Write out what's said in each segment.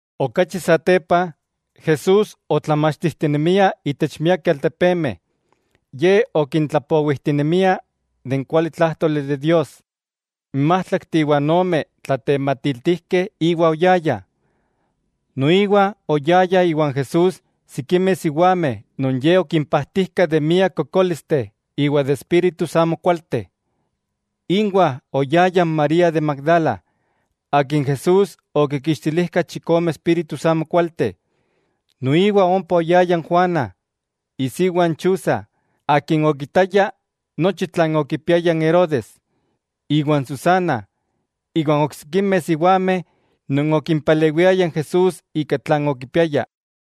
Okachi satepa, Jesús otlamachtijtijtinemia itech miakeh altepemeh. Ye okintlapowijtinemia de n kualitlájtoli de Dios. N májtlakteh iwa ome tlatematiltijkeh íwa oyayah. Noiwa oyayah iwan Jesús sikimeh siwameh non Ye okimpajtijka de miak kokólisteh iwa de espíritus amokualteh. Inwah oyaya n María de Magdala, akin Jesús okinkixtilijka chikome espíritus amokualteh. Noiwa ompa oyaya n Juana, isiwa n Chuza, akin okitaya nochi tlan okipiaya n Herodes, iwa n Susana, iwa n oksikimeh siwameh non okipalewiayah n Jesús ika tlan okipiayah.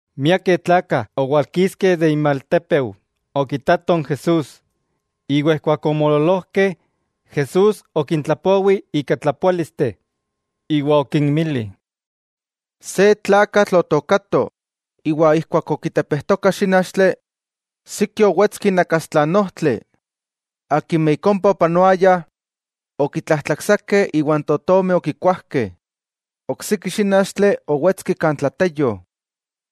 Miakeh tlakah owalkiskeh de inmaltépeu okitatoh n Jesús; iwa ijkuak omoololojkeh, Jesús okintlapowi ika tlapoálisteh, iwa okinmili: —Se tlakatl otookato, iwa ijkuak okitepejtoka xínachtli, siki owetski inakastla n ojtli, akimeh ik ompa opanoayah okitlajtlaksakeh iwa n totomeh okikuajkeh. Oksiki xínachtli owetski kan tlateyo;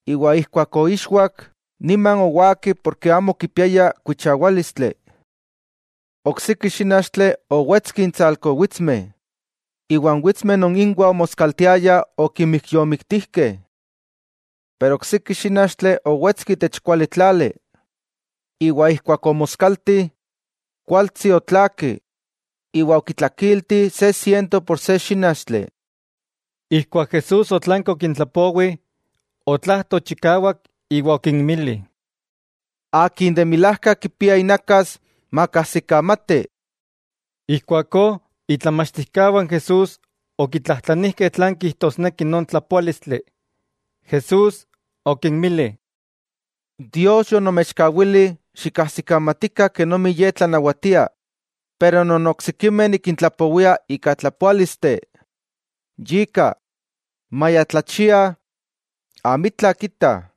iwa ijkuak oixwak niman owaki ken amo okipiaya kuichawálistli. Oksiki xínachtli owetski intsalko witsmeh, iwa n witsmeh non inwah omoskaltiayah okimijyomiktijkeh. Pero oksiki xínachtli owetski itech kuali tlali; iwa ijkuak omoskalti, kualtsi otlaaki, iwa okitlakilti se siento por se xínachtli. Ijkuak Jesús otlanki okintlapowi, otlajto chikawak iwa okinmili: —¡Akin de milajka kipia inakas, makajsikamati! Ijkuakó itlamachtijkawah n Jesús okitlajtlanijkeh tlan kijtosneki non tlapoálistli. Jesús okinmili: —Dios yonomechkawili xikajsikamatikah kenomi Ye tlanawatia. Pero non oksikimeh nikintlapowia ika tlapoálisteh. Yika, maya tlachiah, amitla kitah,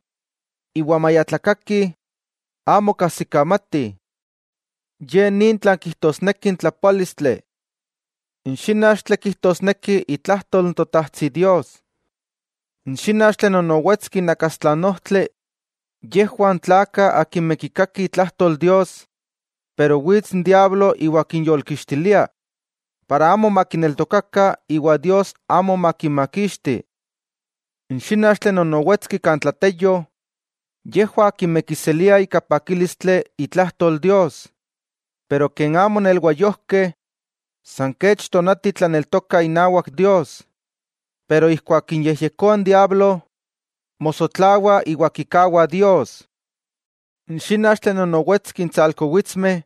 iwa maya tlakakih amo kajsikamatih. 'Ye ni tlan kijtosneki n tlapoálistli: N xínachtli kijtosneki itlajtol n Totajtsi Dios. N xínachtli non owetski inakastla n ojtli, yejwah n tlakah akimeh kikakih itlajtol Dios, pero wits n diablo iwa kinyolkixtilia para amo makineltokakah iwa Dios amo makinmakixti. N xínachtli non owetski kan tlateyo, yejwah akimeh kiseliah ika pakílistli itlajtol Dios, pero ken amo nelwayojkeh, san kech tonati tlaneltokah inawak Dios, pero ijkuak kinyejyekoa n diablo, mosotlawah iwa kikawah Dios. N xínachtli non owetski intsalko witsmeh,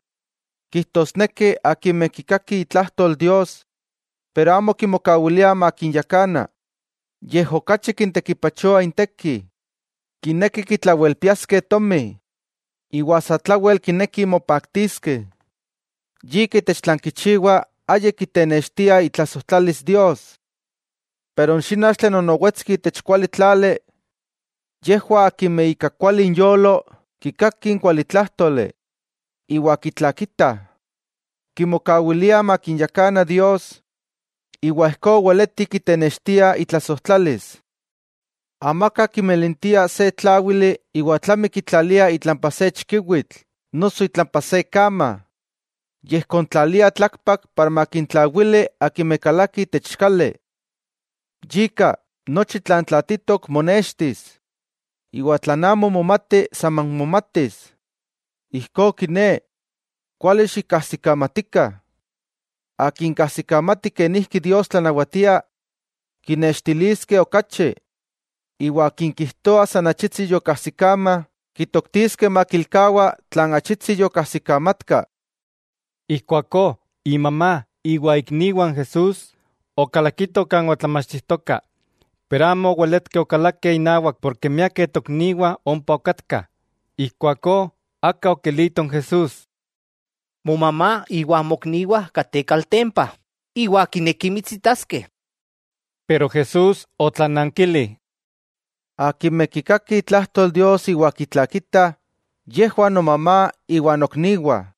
kijtosneki akimeh kikakih itlajtol Dios, pero amo kimokawiliah makinyakana, yej okachi kintekipachoa inteki. Kinekih kitlawelpiaskeh tomi iwa satlawel kinekih mopaktiskeh, yika itech tlan kichiwah ayik kitenextiah itlasojtlalis Dios. Pero n xínachtli non owetski itech kuali tlali, yejwah akimeh ika kuali inyolo kikakih n kualitlájtoli iwa kitlakitah, kimokawiliah makinyakana Dios iwa ijkó weletih kitenextiah itlasojtlalis. 'Amaka kimilintia se tláwili iwa tlami kitlalia itlampa se chikiwitl noso itlampa se kama, yej kontlalia tlakpak para makintlawili akimeh kalakih itech kali. Yika, nochi tlan tlaatitok monextis, iwa tlan amo momati saman momatis. 'Ijkó kiné, kuali xikkajsikamatikah, akin kajsikamati kenijki Dios tlanawatia, kinextiliskeh okachi, iwa akin kijtoa san achitsi yokajsikama kitoktiskeh makilkawa tlan achitsi yokajsikamatka. Ijkuakó imamá iwa ikniwah n Jesús okalakitoh kan otlamachtijtoka, pero amo oweletkeh okalakeh inawak porke miakeh tokniwah ompa okatkah. Ijkuakó aka okilito n Jesús: —Momamá iwa mokniwah kateh kaltempa, iwa kinekih mitsitaskeh. Pero Jesús otlanankili: —Akimeh kikakih itlajtol Dios iwa kitlakitah, yejwah nomamá iwa nokniwah.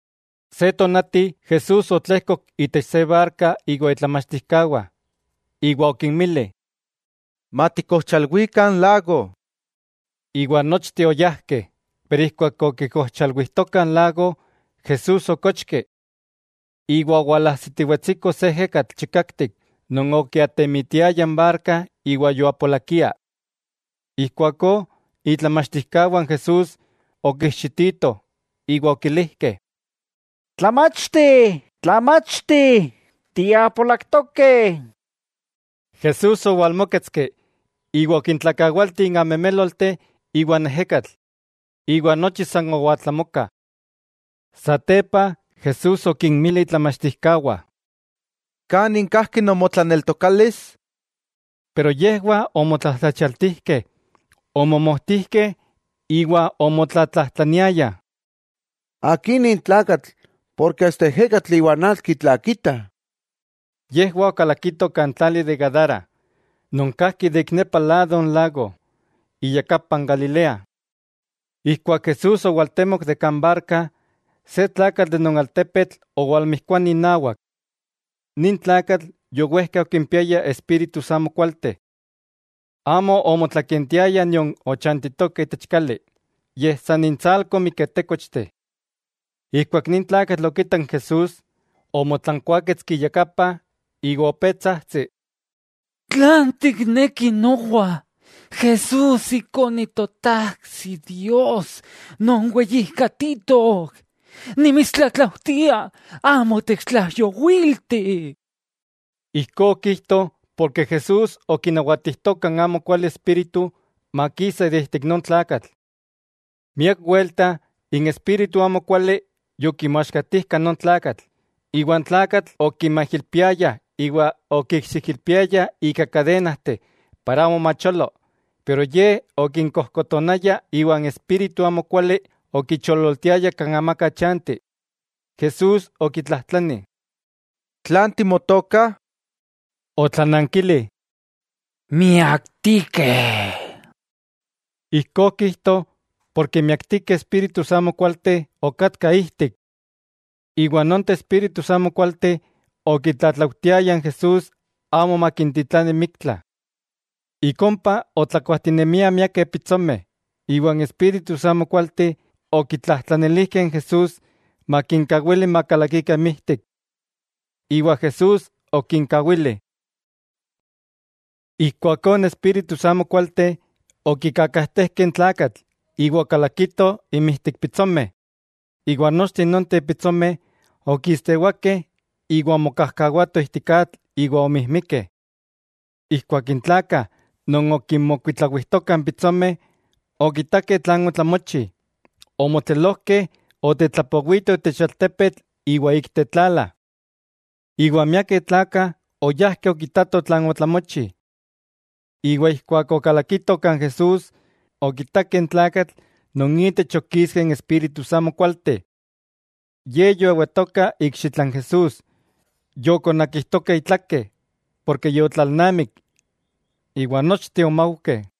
Se tonati Jesús otlejkok itech se barka iwa itlamachtijkawah, iwa okinmili: —Matikojchalwikah n lago. Iwa nochteh oyajkeh, pero ijkuak okikojchalwijtokah n lago, Jesús okochki. Iwa owalajsitiwetsiko se ejekatl chikaktik non okiatemitiaya n barka iwa yoapolakia. Ijkuakó itlamachtijkawah n Jesús okiijxititoh iwa okilijkeh: —¡Tlamachti, Tlamachti! ¡Tiapolaktokeh! Jesús owalmóketski iwa okintlakawalti n amemélolteh iwa n ejekatl; iwa nochi san owaltlamoka. Satepa Jesús okinmili itlamachtijkawah: —¿Kanin kajki nomotlaneltokalis? Pero yejwah omotlajtlachialtijkeh, omomojtijkeh iwa omotlatlajtlaniayah: —¿Akí nin tlakatl, porke asta ejekatl iwa n atl kitlakita? Yejwah okalakitoh kan tlali de Gadara, non kajki ik nepa lado n lago, iyakapa n Galilea. Ijkuak Jesús owaltemok de kan barka, se tlakatl de non altepetl owalmijkuani inawak. Nin tlakatl yowejka okimpiaya espíritus amokualteh. Amo omotlakentiaya nion ochanchitoka itech kali, yej san intsalko miketékochteh. Ijkuak nin tlakatl okitak n Jesús, omotlankuáketski iyakapa iwa opé tsajtsi: —¿Tlan tikneki nowa, Jesús, Ikone n Totajtsi Dios non weyijkatitok? Nimitstlatlaujtia amo techtlaijyowilti. Ijkó okijto porke Jesús okinawatijtoka n amokuali espíritu makisa de ijtik non tlakatl. Miak welta n espíritu amokuali yokimoaxkatijka non tlakatl, iwa n tlakatl okimaijilpiayah iwa okikxiijilpiayah ika kadenajteh para amo macholo, pero ye okinkojkotonaya iwa n espíritu amokuali okichololtiaya kan amaka chanti. Jesús okitlajtlani: —¿Tlan timotoka? Otlanankili: —Miaktikeh. Ijkó okijto porke miaktikeh espíritus amokualteh okatkah ijtik. Iwa nonteh espíritus amokualteh okitlatlaujtiayah n Jesús amo makintitlani miktla. Ik ompa otlakuajtinemiah miakeh pitsomeh, iwa n espíritus amokualteh okitlajtlanilijkeh n Jesús makinkawili makalakikah inmijtik; iwa Jesús okinkawili. Ijkuakó n espíritus amokualteh okikakajtejkeh n tlakatl iwa okakalakitoh inmijtik n pitsomeh, iwa nochteh nonteh pitsomeh okistewakeh iwa onmokajkawatoh ijtik atl iwa omijmikeh. Ijkuak n tlakah non okinmokuitlawijtokah n pitsomeh okitakeh tlan otlamochi, omotlelojkeh otetlapowitoh itech altepetl iwa ik tetlala. Iwa miakeh tlakah oyajkeh okitatoh tlan otlamochi. Iwa ijkuak okalakitoh kan Jesús, okitakeh n tlakatl non itech okiskeh n espíritus amokualteh. Ye yoewatoka ikxitla n Jesús, yokonakijtoka itlake, porke yotlalnamik, iwa nochteh omaujkeh.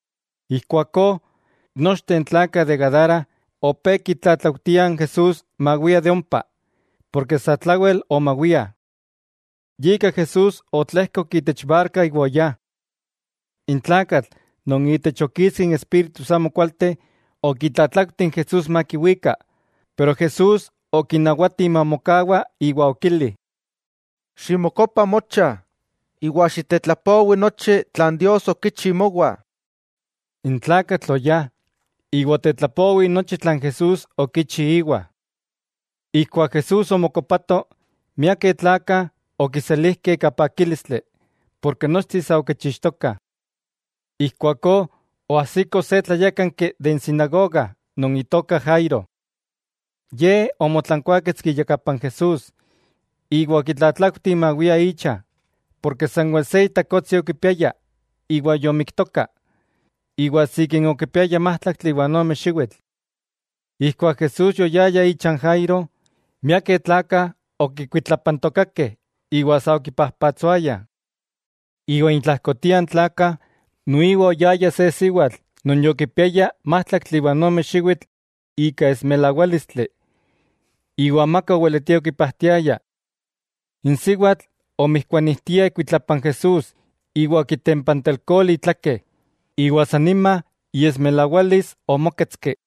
Ijkuakó, nochteh n tlakah de Gadara opé kitlatlaujtiah n Jesús mawia de ompa, ken satlawel omawiah. Yika Jesús otlejkok itech barka iwa oyá. N tlakatl non itech okiskeh n espíritus amokualteh okitlatlaujti n Jesús makiwika, pero Jesús okinawati mamokawa iwa okili: —Ximokopa mocha, iwa xiktetlapowi nochi tlan Dios okichi mowa. N tlakatl oyá, iwa otetlapowi nochi tlan Jesús okichi íwa. Ijkuak Jesús omokopato, miakeh tlakah okiselijkeh ika pakílistli, porke nochteh sa okichixtokah. Ijkuakó oajsiko se tlayákanki de n sinagoga non itoka Jairo. Ye omotlankuáketski iyakapa n Jesús iwa okitlatlaujti mawia icha, porke sanwel se itakotsi okipiaya iwa yomiktoka, iwa sikin okipiaya májtlaktli iwa ome xiwitl. Ijkuak Jesús yoyaya icha n Jairo, miakeh tlakah okikuitlapantokakeh iwa sa okipajpatsoayah. Iwa intlajkotiah n tlakah noiwa oyaya se siwatl non yokipiaya májtlaktli iwa ome xiwitl ika esmilawálistli, iwa amaka oweletia okipajtiaya. N siwatl omijkuanijtia ikuitlapa n Jesús iwa okitempantelkoli itlake, iwa san nima iesmilawalis omóketski.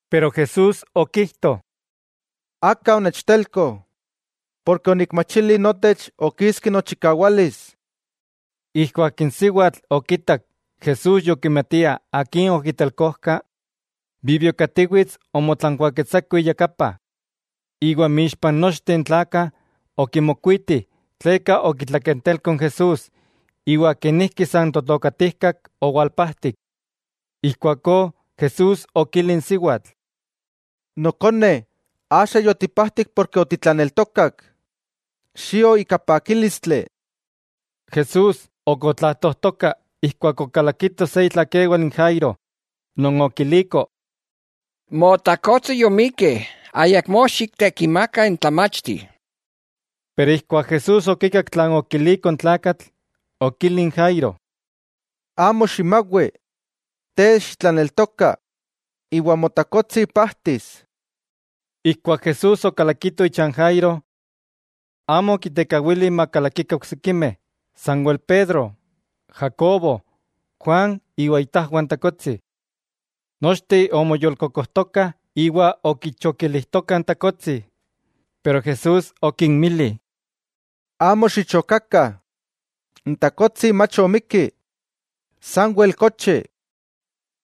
Pero Jesús okijto: —Aka onechtelko, porke onikmachili notech okiski nochikawalis. Ijkuak n siwatl okitak Jesús yokimatia akin okitelkojka, bibiokatiwits omotlankuáketsato iyakapa. Iwa inmixpah nochteh n tlakah okimokuiti tleka okitlakentelko n Jesús iwa kenijki san totokatijkak owalpajtik. Ijkuakó Jesús okili n siwatl: —Nokone, axa yotipajtik porke otitlaneltokak. Xio ika pakílistli. Jesús ok otlajtojtoka ijkuak okalakiko se itlakewal n Jairo non okiliko: —Motakotsi yomikki, ayakmó xiktekimaka n Tlamachti. Pero ijkuak Jesús okikak tlan okiliko n tlakatl, okili n Jairo: —Amo ximawi, te xitlaneltoka, iwa motakotsi pajtis. Ijkuak Jesús okalakito icha n Jairo. Amo okitekawili makalakikah oksikimeh, sanwel Pedro, Jacobo, Juan iwa itajwah n takotsi. Nochteh omoyolkokojtokah iwa okichokilijtokah n takotsi. Pero Jesús okinmili: —Amo xichokakah; n takotsi mach omikki, sanwel kochi.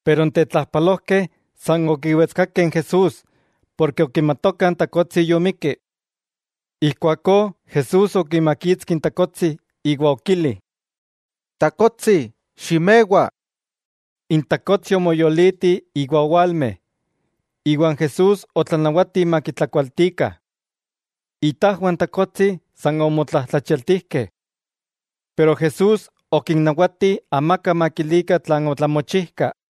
Pero n tetlajpalojkeh san okiwetskakeh n Jesús porke okimatokah n takotsi yomikki. Ijkuakó Jesús okimakitski n takotsi iwa okili: —Takotsi, ximewa. N takotsi omoyoliti iwa owalme; iwa n Jesús otlanawati makitlakualtikah. Itajwah n takotsi san omotlajtlachialtijkeh. Pero Jesús okinnawati amaka makilikah tlan otlamochijka.